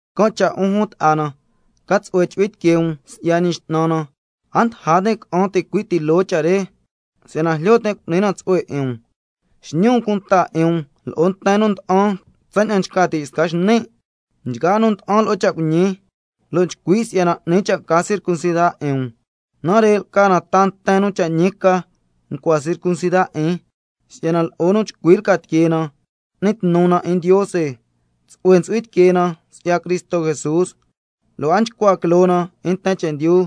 Can' cha' 'un jun ta'a na ca tsu'hue chu'hui tiquee um si'ya Ñi X'nan na, a ndaja tin' ca'an ticui' ti loo cha' re si'yana jlyo tin' cu'ni na tsu'hue 'in um. Xñi um cunta 'in um lo'o nten nu nda'an tsaña'an nchca ti' sca xni', nchgaa nu nda'an lo'o cha' cuiñi, lo' nchcui' si'yana 'ni cha' ca circuncida 'in um. Nare' lca na ta nten nu cha' ñi ca ncua circuncida 'in, si'yana lo'o nu chcui lca tiquee na n'ni tnu na 'in Ndiose, tsu'hue ntsu'hui tiquee na si'ya Cristo Jesús, lo' a nchcua quiloo na 'in nten chendyu.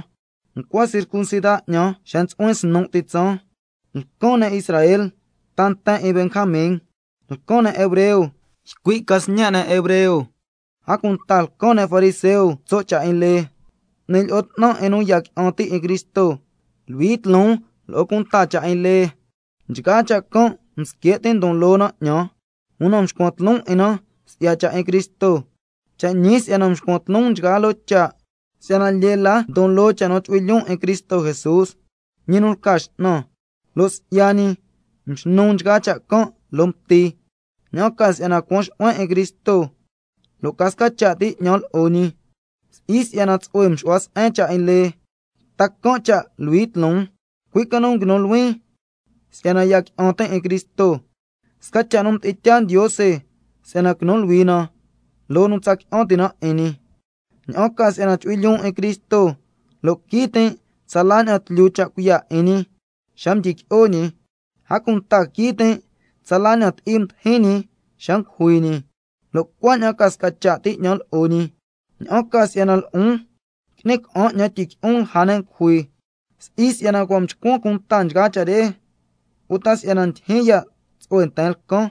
si'yana ncua circuncida 'ñan xa ntsu'huin snu' ti tsaan, lcan ne' Israel ta nten 'in Benjamin, lcan ne' hebreo ycui' ca sñe' ne' hebreo, a cunta lcan ne' fariseo tso' cha' 'in lee, mducui ncha'an 'in nu ya qui'an ti' 'in Cristo, luhui tloon lo'o cunta cha' 'in lee. Nchgaa cha' can' msque' tin' si'yana ndon loo na 'ñan, una mscuan tloon 'in na si'ya cha' 'in Cristo. Cha' ñi si'yana nscuan tloon nchgaa loo cha', si'yana lyee la ndon loo cha' nu chu'hui lyoon 'in Cristo Jesús, ñi nu lca X'nan, lo' si'ya ñi mxnun nchgaa cha' can' loo mti, ña'an ca si'yana cuan xu'huen 'in Cristo, lo' ca sca cha' ti 'ñan lo'o ñi, si'i si'yana tsu'hue mxu'huan se'en cha' 'in lee, ta can' cha' luhui tloon, cui' ca nu nguinun luhuin si'yana ya qui'an tin' 'in Cristo, sca cha' nu mdi'in tyaa Ndiose si'yana quinu luhui na loo nu tsa qui'an ti' na 'in ñi, ña'an ca si'yana chu'hui lyoon 'in Cristo, lo' quii tin' tsala ña'an tlyu cha' cuiya' 'in ñi xa mdyiqui'o ñi, a cunta quii tin' tsala nu ti'i mdijin ñi xa ngujui ñi, lo' cuaña'an ca sca cha' ti 'ñan lo'o ñi, ña'an ca si'yana lo'on qui'ni ca'an 'ñan tyiqui'on lja ne' ngujui. Si'i si'yana cua' mchcuan cunta nchgaa cha' re uta si'yana ndyijyin ya' tsu'hue nten lcan,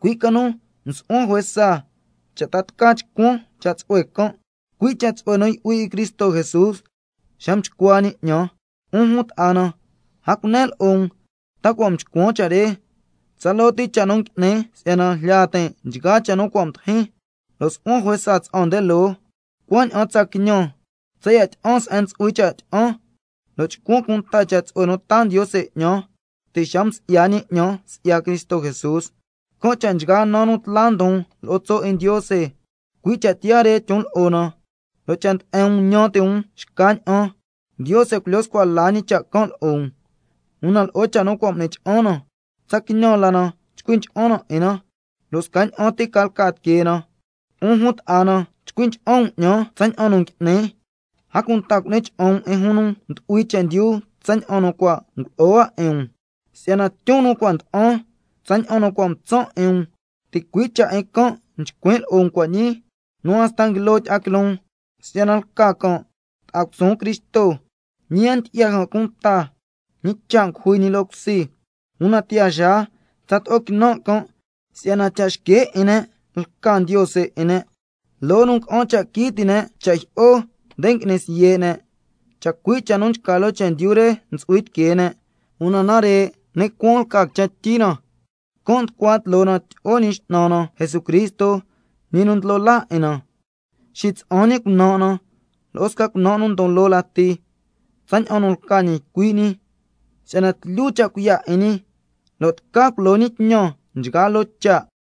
cui' ca nu nsu'huan juesa lo'o cha' re, cha' tca chcuan cha' tsu'hue can', cui' cha' tsu'hue nu ntsu'hui 'in Cristo Jesús xa mchcua ñi 'ñan. 'Un jun ta'a na, a cunen lo'o um ta si'yana cua' mchcuan cha' re, tsaloo ti cha' nu ngui'nin si'yana jlya tin' nchgaa cha' nu cua' mdijin, lo' su'huan juesa tsa'an nde loo, cuaña'an tsa quiñan tsaya' tyi'an se'en ntsu'hui cha' tyi'an, lo' chcuan cunta cha' tsu'hue nu taa Ndiose 'ñan ti' xa nu msi'ya ñi 'ñan si'ya Cristo Jesús. Can' cha' nchgaa naa nu tla ndon lo'o tso' 'in Ndiose, cui' cha' tiyaa re tyon lo'o na, lo' cha' nde'en um ñan ti' um xca ña'an, Ndiose culyo scua la ñi cha' can' lo'o um. Una lo'o cha' nu cua' m'ni cha'an na, tsa quiñan la na chcui ncha'an na 'in na, lo' scaña'an ti ca lca tiquee na. 'Un jun ta'a na, chcui ncha'an um 'ñan tsaña'an nu ngui'nin, a cunta cu'ni cha'an um 'in jun nu ndu'hui chendyu tsaña'an nu cua' ngulo'o hua 'in um. Si'yana tyun nu cua' nda'an tsaña'an nu cua' mtsan' 'in um, ticui' cha' 'in can' nchcuin' lo'o um cua' ñii nu hasta nguilo tyi'a quiloon, si'yana lca can' ta'a cusuun Cristo, ñi a ndyi'ya can' cunta ñi cha' ngujui ñi loo cusi. Una tiyaa xaa tsato'o quinan' can' si'yana cha' xque' 'in ne' lca ndiose 'in ne', loo nu nga'an cha' quii ti' ne' cha' jyi'o nde ngui'ni siye' ne', chacui' cha' nu nchca loo chendyu re ntsu'hui tiquee ne'. Una nare' ni' cuaan lca quichen tyi na, can' nducua tloo na tyi'o Ñi X'nan na Jesucristo, Ñi nu ndlo laa 'in na, xitsa'an ñi cunan' na lo'o sca cunan' nu ndon loo lati tsaña'an nu lca ñi ycui' ñi, si'yana tlyu cha' cuiya' 'in ñi lo' tca culo ñi tñan nchgaa loo cha'.